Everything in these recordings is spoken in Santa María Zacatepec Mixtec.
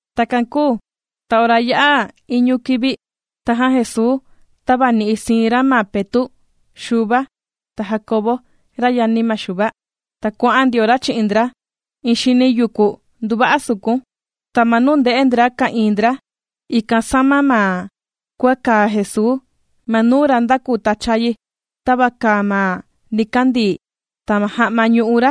Takan kūu ta ora yā'a iñu kivi, tajan Jesuu tāvani'i siin ra ma Petu', Xuva, ta Jandiau, ra yani ma Xuva, ta kuà'an ndio ra chi'in ndra iin xini yuku nduva'a sukun. Ta ma nuu ndè'e ndra ka'ìin ndra, ikan sāma ma kua kàa Jesuu. Ma nuu ra ndākuu tacha yi, tava kàa ma nikandii, ta ma ja'ma ñù'u ra,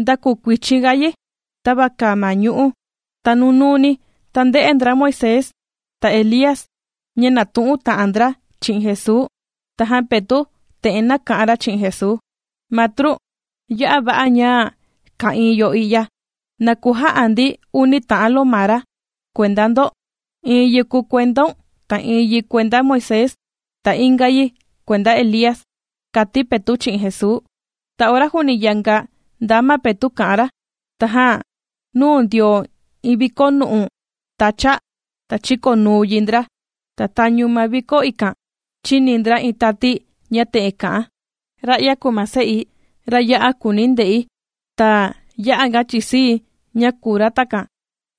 ndākuu kuichin ga yi tava kàa ma ñu'ú. Ta nunuuni, ta ndē'e ndra Moisés, ta Elía, ña nàtu'un ta'an ndra chi'in Jesuu. Tajan Petu' te'en nāka'an ra chi'in Jesuu: ―Matru, ¡ya'a va'a ña ka'ìin yo i'ya! Na kuja'a ndi uni ta'an lomara kuenda ndo: iin yi kùu kuendaun, ta iin yi kuenda Moisés, ta inga yi kuenda Elía ―kàti Petu' chi'in Jesuu. Ta ora juuni yanga ndaa ma Petu' kà'an ra, tajan nūu ndio iin vikonu'u tacha, ta chīkonuu yi ndra, ta tañu ma vikó ikan, chīni ndra iin tati ña te'en kà'an: ―Ra'ya kùu ma Se'i, ra ya'a kùuni̱ nde'i, ta ya'a ga chìsii̱ chi'in ra.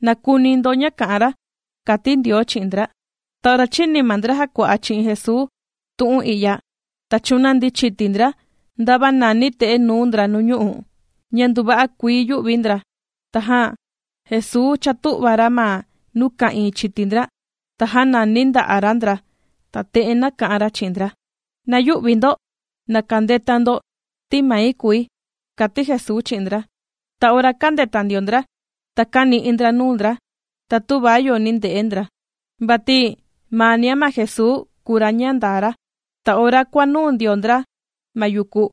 ¡Na kuni ndo ma ña kà'an ra! ―kàti Ndioo chi'in ndra. Ta ora chīni ma ndra jàkua'a chi'in Jesuu tu'un i'ya, ta chūnandi chiti ndra ndava nàni te'e nuu ndra nuu ñu'u', ña nduva'a kuii yū'vi ndra. Tajan Jesuu chātu'va ra ma nuu ka'ìin chiti ndra, ta jānani nda'a' ra ndra, ta te'en nāka'an ra chi'in ndra: ―Na yü'vi ndo, na kandeta ndo, ti mai kùi ―kàti Jesuu chi'in ndra. Ta ora kāndeta ndio ndra, ta kāni'i ndra nuu ndra, ta tüva yo ni nde'e ndra, vati maania ma Jesuu kùu ra ña ndaa ra. Ta ora kuànuu ndio ndra ma yuku,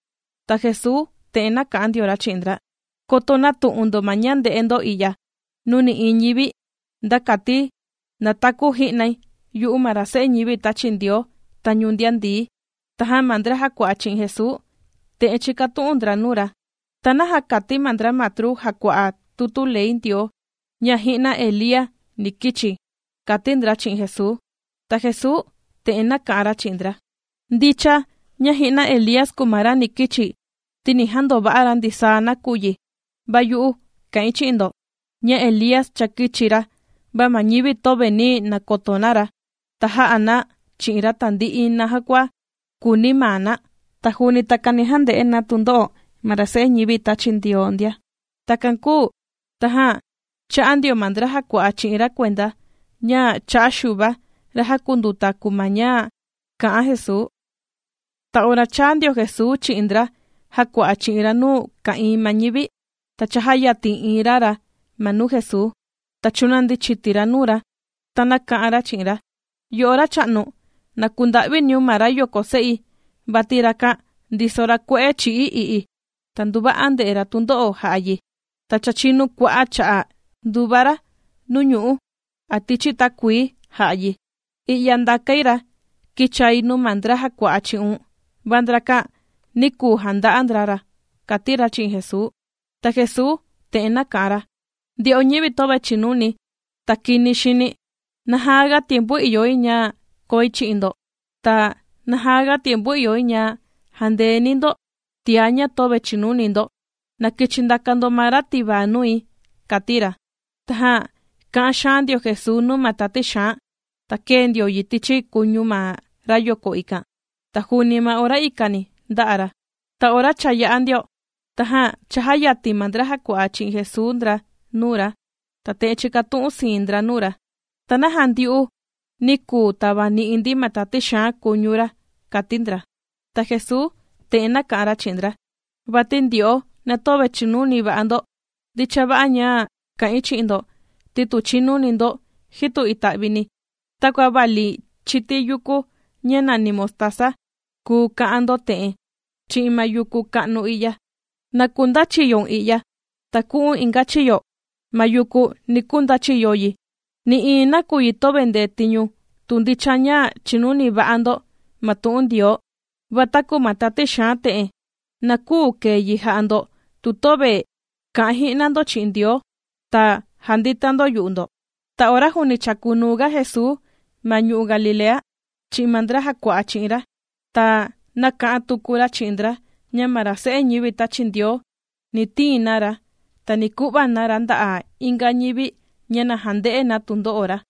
ta Jesuu te'en nāka'an ndio ra chi'in ndra: ―Koto nätu'un ndo ma ña ndē'e ndo i'ya nuu nï'iin ñivi, nda kati nataku ji'nai yu'u ma ra Se'e ñivi tāchi Ndioo, tañu ndian ndií. Tajan ma ndra jàkua'a chi'in Jesuu, te'en chīkatu'un ndra nuu ra: ―¿Ta naja kàti ma ndra matru jàkua'a tutu ley Ndioo, ña ji'na Elía, ni kichi? ―kàti ndra chi'in Jesuu. Ta Jesuu te'en nāka'an ra chi'in ndra: ―Ndicha, ña ji'na Elía kùu ma ra ni kichi, ti ni jandova'a ra ndisaa nakuyi. Va yu'u, kà'in chi'in ndo, ña Elía cha kīchi ra, va ma ñivi töve nī nakoto na ra, ta jā'a na chi'in ra tandi'i ma naja kua kūuni maa na. Ta juuni takan ni jande'e na tundo'o ma ra Se'e ñivi tāchi Ndioo ndia. Takan kūu tajan chā'a ndio ma ndra jàkua'a chi'in ra kuenda, ña cha'a' Xuva ra jàkunduta kùu ma ña kà'an Jesuu. Ta ora chāa ndio Jesuu chi'in ndra jàkua'a chi'in ra nuu ka'ìin ma ñivi, ta chājayatin iin ra ra ma nuu Jesuu, ta chūnandi chiti ra nuu ra, ta nāka'an ra chi'in ra: ―Yo'o Racha'nu, na kunda'viniun ma rayoko se'i, vati rakan ndiso ra kue'e chì'i i'i, ta nduva'a ndè'e ra tundo'o jà'a yi. Ta cha chinu kua'a' cha'a' ndùva ra nuu ñu'ú, a tichi takuii, jà'a yi. I'ya ndàkai ra kīchai nuu ma ndra jàkua'a chi'un, va ndrakan, nī kuu janda'a ndra ra ―kàti ra chi'in Jesuu. Ta Jesuu te'en nāka'an ra: ―¡Ndyo'o ñivi töve chìnuni, ta kini xini! ¿Naja ga tiempu ìyo yi ña koi chi'in ndo? Ta, ¿naja ga tiempu ìyo yi ña jandeeni̱ ndo tiá ña töve chìnuni ndo? Na kichi ndaka ndo ma ra tivaa nui ―kàti ra. Tajan kā'an xaan ndio Jesuu nuu ma tati xaan, ta kēe ndio yi tichi kuñu ma rayoko ikan, ta juuni ma ora ikani ndā'a ra. Ta ora cha yā'a ndio, tajan chājayatin ma ndra jàkua'a chi'in Jesuu ndra nuu ra, ta te'en chīkatu'un siin ndra nuu ra: ―¿Ta naja ndyu'u, nī kuu tavani'i ndi ma tati xaan kuñu ra? ―kàti ndra. Ta Jesuu te'en nāka'an ra chi'in ndra: ―Vati ndyo'o na töve chìnuni va'a ndo. Ndicha va'a ña ka'ìin chi'in ndo, ti tu chìnuni ndo, jitu ita'vini, takua vali iin chiti yukú ña nàni mostaza, kùu ka'an ndo, te'en chi'in ma yuku ka'nu i'ya: “Na kundachiyoun i'ya, ta ku'u̱n inga chiyo.” Ma yuku ni kundachiyo yi. Nï'iin nakuyi töve ndetiñu tu ndicha ña chìnuni va'a ndo ma tu'un Ndioo. Va taku ma tati xaan te'en, na küu kèe yi jà'a ndo tu töve ka'an ji'na ndo chi'in Ndioo, ta jandita ndo yu'u ndo. Ta ora juuni chàkunuu ga Jesuu ma ñu'u' Galilea, chi'in ma ndra jàkua'a chi'in ra, ta nāka'an tuku ra chi'in ndra, ña ma ra Se'e ñivi tāchi Ndioo, ni tiin na ra, ta ni ku'va na ra nda'a inga ñivi ña na jande'e na tundo'o ra.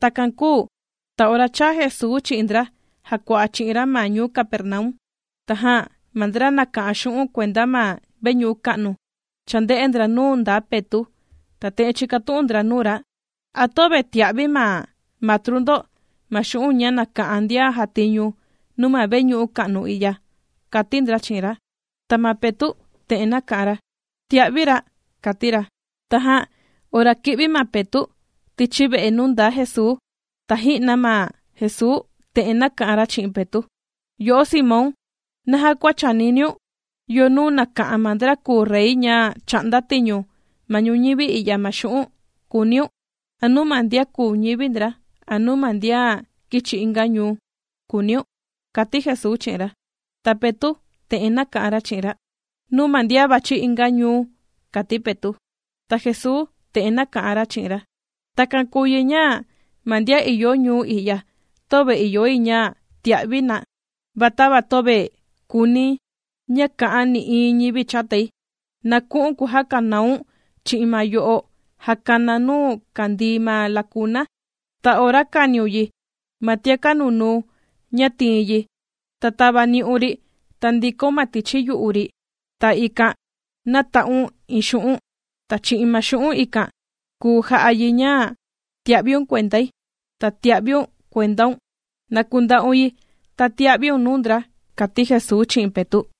Takan kūu ta ora chāa Jesuu chi'in ndra jàkua'a chi'in ra ma ñuu Capernaum, tajan ma ndra nàka'an xu'un' kuenda ma veñu'u ka'nu chānde'e ndra nuu ndaa Petu', ta te'en chīkatu'un ndra nuu ra: ―¿A töve tìa'vi ma matru ndo ma xu'un' ña nàka'an ndian jàtiñu nuu ma veñu'u ka'nu i'ya? ―kàti ndra chi'in ra. Ta ma Petu' te'en nāka'an ra: ―Tìa'vi ra ―kàti ra. Tajan ora kī'vi ma Petu' tichi ve'e nuu ndaa Jesuu, ta ji'na ma Jesuu te'en nāka'an ra chi'in Petu': ―¿Yo'o Simón, naja kua chàniniun? ¿Yo nuu nàka'an ma ndra kùu rey ña chà'nda tiñu ma ñuñivi i'ya ma xu'un'?, kùuniun: ¿A nuu ma ndian kùu ñivi ndra, a nuu ma ndian kìchi inga ñuu?, kùuniun ―kàti Jesuu chi'in ra. Ta Petu', te'en nāka'an ra chi'in ra: ―Nuu ma ndian vàchi inga ñuu ―kàti Petu'. Ta Jesuu te'en nāka'an ra chi'in ra: ―Takan kùu yi ña ma ndian ìyo ñuu i'ya, töve ìyo yi ña tia'vi na. Va tava töve kùuni̱ ña ka'an nï'iin ñivi chatai, na ku'u̱n kujakanaun chi'in ma yo'o jàkanaa nuu kàndii ma lakuna, ta ora kàniun yi, ma tiaka' nunuu ña tiin yi, ta tavani'un ri, ta ndikaun ma tichi yu'u ri, ta ikan nata'un iin xu'un'. Ta chi'in ma xu'un' ikan kùu ja'a yi ña tia'viun kuendai, ta tia'viun kuendaun. Na kunda'un yi, ta tia'viun nuu ndra ―kàti Jesuu chi'in Petu'.